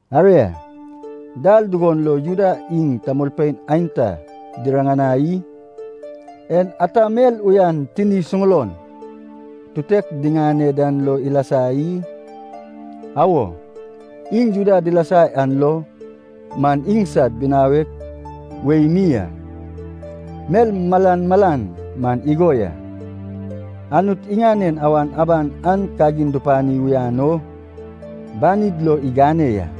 Aria, dal dugon lo Juda iŋ tamolpein aenta diriŋanai i? En ata mel uyan tini suŋulon tutek diŋane dan lo ilasa i? Awo, iŋ Juda dilasa yan lo man iŋsad binawek wei mi a. Mel malan malan man igo ya, Anut iŋanen awan aban an kagin dupani uyan o banid lo igane ya.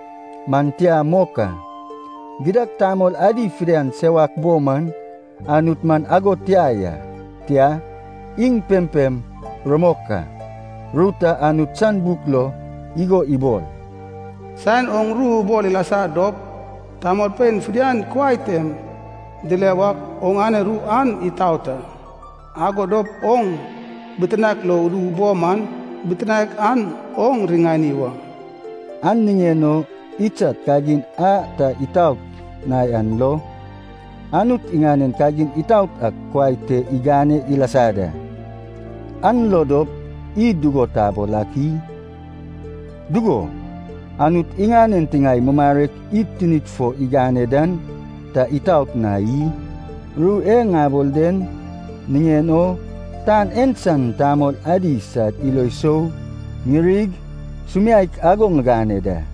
Man tia mok a. Gidad tamol adi fidian sewak bo man Anut man ago tia ya, tia, iŋ pempem rumok a. Ru ta Anut san buk lo igo ibol, “Saen oŋ ru ubol ilasa dop, tamolpein fidian kuai tem dile wak oŋane ru an itaot a, ago dop oŋ bitinaek lo udu bo man, bitinaek an oŋ riŋani wa.” An niŋen o idsad kagin a ta itaot na yan lo, Anut iŋanen kagin itaot ak kuai te igane ilasa da. An lo dop, id dugo tabol ak i? Dugo, Anut iŋanen tiŋae mumarek id tinid fo igane dan ta itaot na i? (Ru e ŋabol den niŋen o, tan en san tamol adi sad ilo sou ŋirig sumiaek ago ŋigane da.)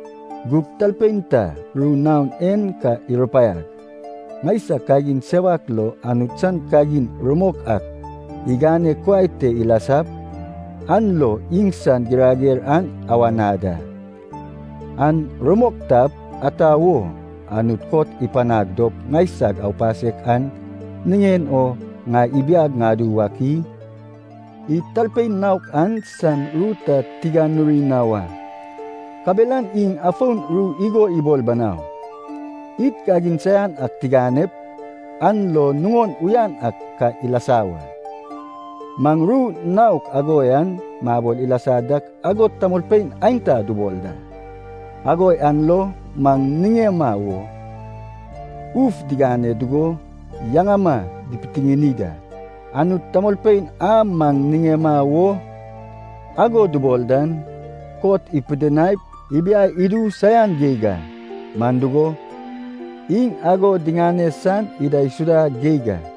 Gug talpein ta ru naon en ka irupaiag, “Ŋaisag kagin sewak lo Anut san kagin rumok ak igane kuai te ilasap an lo iŋsan girager an awana da. An rumok tap, ata wo Anut kot ipanag dop ŋaisag aupasek an niŋen o ŋai ibiag ŋadu wak i?” Id talpein naok an san ru ta tiganuri na wa, kabelan iŋ afon ru igo ibol banau, “Id kagin saian ak tiganep, an lo nuŋon uyan ak ka ilasa wa.” Maŋ ru naok ago yan mabol ilasa dak ago tamolpein aenta dubol da. Ago yan lo maŋ niŋema wo uf digane dugo, yaŋama dipitiŋini da. Anut tamolpein a maŋ niŋema wo ago dubol dan, kot ipidinaip ibiai idu saian geig a, man dugo, iŋ ago diŋane san idaisuda geig a.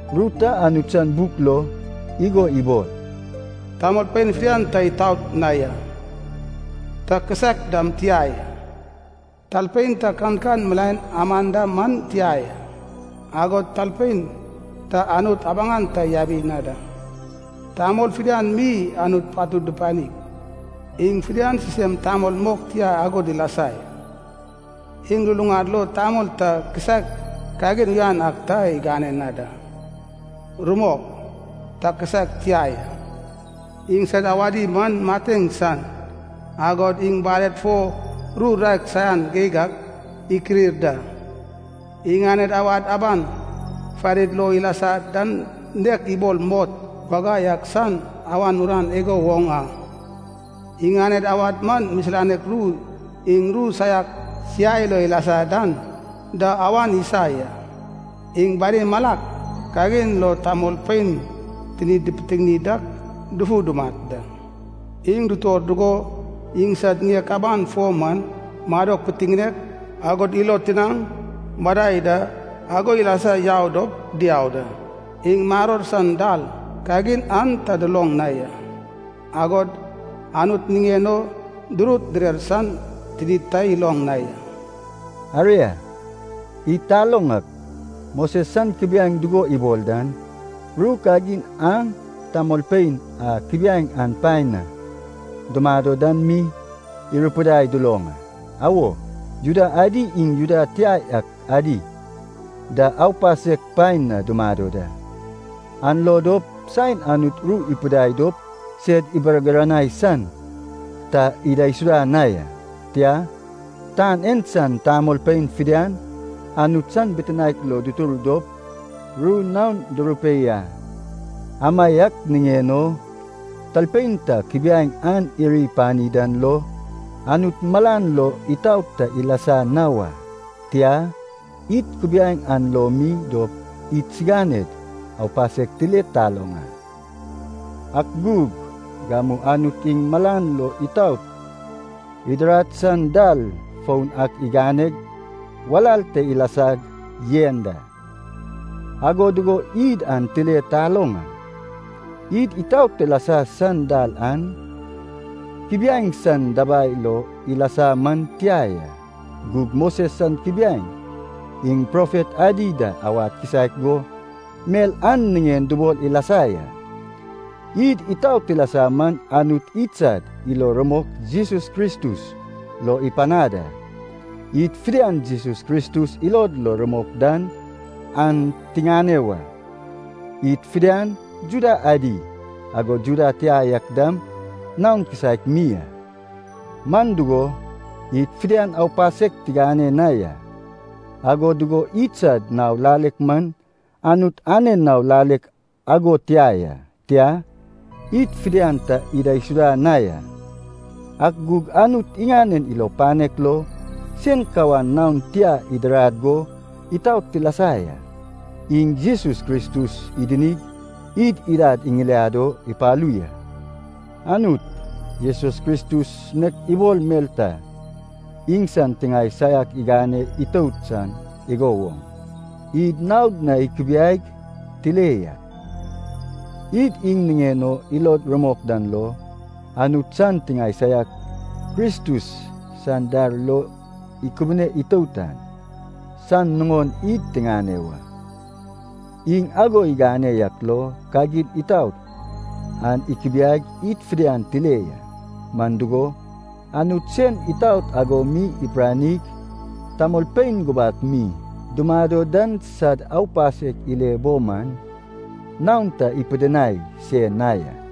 Ru ta Anut san buk lo igo ibol, “Tamolpein fidian ta itaot na ya, ta kisaek dam tia ya. Talpein ta kankan milaen aman da man tia ya, agod talpein ta Anut abaŋan ta yabi na da. Tamol fidian mi Anut patud dupanig, iŋ fidian sisem tamol mok tia ago dilasa ya. Iŋ luluŋad lo tamol ta kisaek kagin uyan ak ta igane na da. Rumok, ta kisaek tia ya.” “Iŋsad awadi man mateŋ san, agod iŋ baled fo ru raek saian geig ak ikirir da.” “Iŋaned awad aban farid lo ilasa dan nek ibol mot wagai ak san awan uran igo woŋ a.” “Iŋaned awad man misilanek ru iŋ ru saiak siai lo ilasa dan da awan isa ya.” “Iŋ bani malak kagin lo, tamolpein tinid dipitiŋini dak, dufu dumat da. Iŋ dutor dugo iŋsad ŋiek aban fo man, madok pitiŋinek, agod ilo tinaŋ madai da ago ilasa yau dop diau da. Iŋ maror san dal, kagin an ta duloŋ na ya.” “Agod Anut niŋen o durut direr san tinid ta iloŋ na ya.” Aria, id taloŋ ak, Moses san kubiaeŋ dugo ibol dan, ru kagin an tamolpein a kubiaeŋ an paen na dumado dan mi irupidai duloŋ a. Awo, Juda adi iŋ Juda tia yak adi da aupasek paen na dumado da. An lo dop saen Anut ru ipidinai dop sed ibargiranai san ta idaisuda na ya, tia, tan en san tamolpein fidian Anut san bitinaek lo dutur dop ru naon durupei a. Amaiak niŋen o talpein ta kubiaeŋ an iri pani dan lo Anut malan lo itaot ta ilasa na wa. Tia, id kubiaeŋ an lo mi dop idsiganed aupasek tile taloŋ a. Ak gug, gamu Anut iŋ malan lo itaot idirad san dal foun ak iganeg walal te ilasag yen da, ago dugo id an tile taloŋ a. Id itaot tilasa san dal an kubiaeŋ san dabai lo ilasa man tia ya. Gug Moses san kubiaeŋ iŋ profet adi da awad kisaek go mel an niŋen dubol ilasa ya. Id itaot tilasa man Anut idsad ilo rumok Jesus Kristus lo ipanad a. Id fidian Jesus Kristus ilod lo rumok dan, an tiŋane wa. Id fidian, Juda adi, agod Juda tia yak dam naon kisaek mi a, man dugo, id fidian aupasek tigane na ya. Ago dugo idsad nao lalek man Anut anen nao lalek ago tia ya, tia, id fidian ta idaisuda na ya. Ak gug Anut iŋanen ilo panek lo sen kawan naon tia idirad go itaot tilasa ya. Iŋ Jesus Kristus idinig id idad iŋiliad o ipalu ya. Anut, Jesus Kristus nek ibol mel ta iŋsan tiŋae saiak igane itout san igo woŋ, id naod na ikubiaig tile ya. Id iŋ niŋen o ilod rumok dan lo, Anut san tiŋae saiak Kristus san dar lo ikubune itout an, san nuŋon id tiŋane wa. Iŋ ago igane yak lo kagin itaot an ikubiaig id fidian tile ya. Man dugo, Anut sen itaot ago mi ipiranig tamolpein gubak mi dumado dan sad aupasek ile bo man naon ta ipidinai se na ya.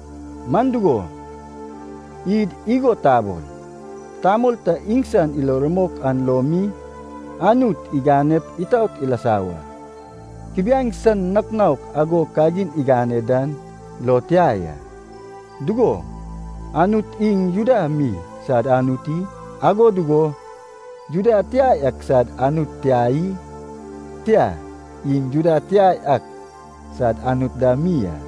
Man dugo, id igo tabol, tamol ta iŋsan ilo rumok an lo mi Anut iganep itaot ilasa wa, kubiaeŋ san nouk nouk ago kagin igane dan lo tia ya. Dugo, Anut iŋ Juda mi sad Anut i? Ago dugo, Juda tia yak sad Anut tia i? Tia, iŋ Juda tia yak sad Anut dam mi a.